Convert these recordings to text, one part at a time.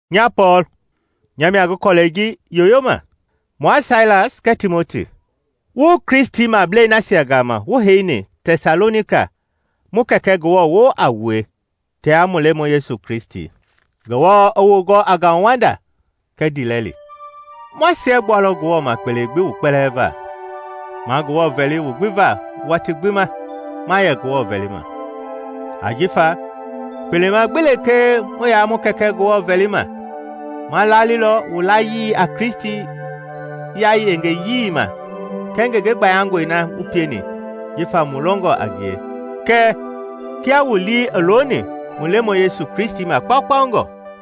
Nya Pɔɔl, nya mia ngi kɔlɛi ji yoyoma. Mua Sailas kɛɛ Timoti, Wu Kristimablei nasia gama wu heini Tɛsalonika, mu Kɛkɛ Ngewɔ woo a wue tia mu Lemɔi Yesu Kristi. Ngewɔ i wu gɔ a ngauwanda kɛɛ ndiilɛli. Ma siɛgbualɔ Ngewɔ ma kpele gbi wu kpɛlɛɛ va, ma Ngewɔ vɛli wu gbi va watii gbi ma yɛ Ngewɔ vɛlima. Ajifa kpelema gbi lekee mu yaa mu Kɛkɛ Ngewɔ vɛlima, ma laalilɔ wu layii a Kristi yaayengeyii ma kɛɛ ngenge gbayangɔi na wu pieni jifa wu longɔ a ngie kɛɛ kia wu lii i looni mu Lemɔi Yesu Kristi ma kpaukpaungɔ.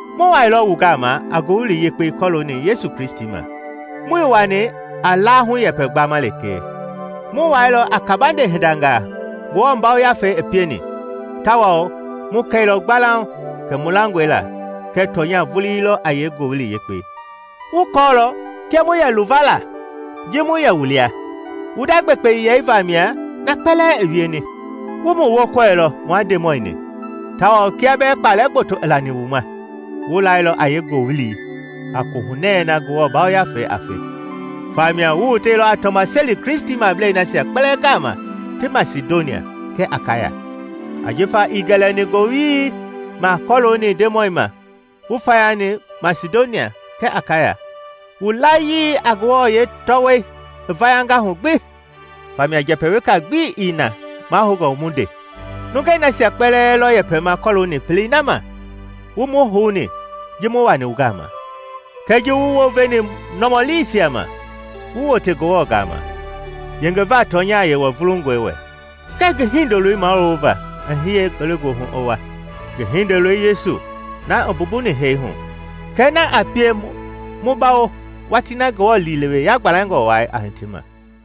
Mu wailɔ wu gama a Ngowili Yekpei kɔɔlooni Yesu Kristi ma, muii wani a laahu-yɛpɛ gbama lekee, mu wailɔ a kaabande hindangaa Ngewɔ Yafei i pieni tawao mu kɛilɔ gbalauŋ kɛ mu langɔe la kɛ tɔnya vulii lɔ a yee-Ngowili Yekpei. Wu kɔɔlɔ kia mu yɛ luva la ji mu yɛ wu lia; wu nda gbekpeyɛi vamia na kpɛlɛɛ i wieni. Wu mu wookɔilɔ mua Ndemɔi-ni; tawao kia bɛɛ kpalɛ gboto i lani wu ma, wu lailɔ a yeengowili a Kohunɛ na Ngewɔ Yafei a fe. Famia wu woteilɔ a tɔmaseli Kristimablei nasia kpɛlɛɛ gama ti Masidonia kɛɛ Akaya. Ajifa ii gɛlɛni ngowili ma kɔlooni Ndemɔi ma wu fayani Masidonia kɛɛ Akaya, wu layii a Ngewɔ yeetɔwɔi i vayanga hu gbi. Famia njɛpɛ weka gbi ii na mahoungɔ mu nde. Nungei nasia kpɛlɛɛ lɔ yɛpɛma kɔɔlooni pelei na ma wu mu houni ji mu wani wu gama, kɛɛ ji wu wounveni nɔmɔliisia ma, wu wote Ngewɔ gama, yengeva tɔnya Yewɔ vulungɔi wɛ, kɛɛ ngi Hindoloi mawulova i hiye ngelegoohu i wa, ngi Hindoloi Yesu na i mbumbuni hee hu, kɛɛ na a pie mu bawo watii na Ngewɔ liilewe yagbalɛngɔ wai a hiti ma.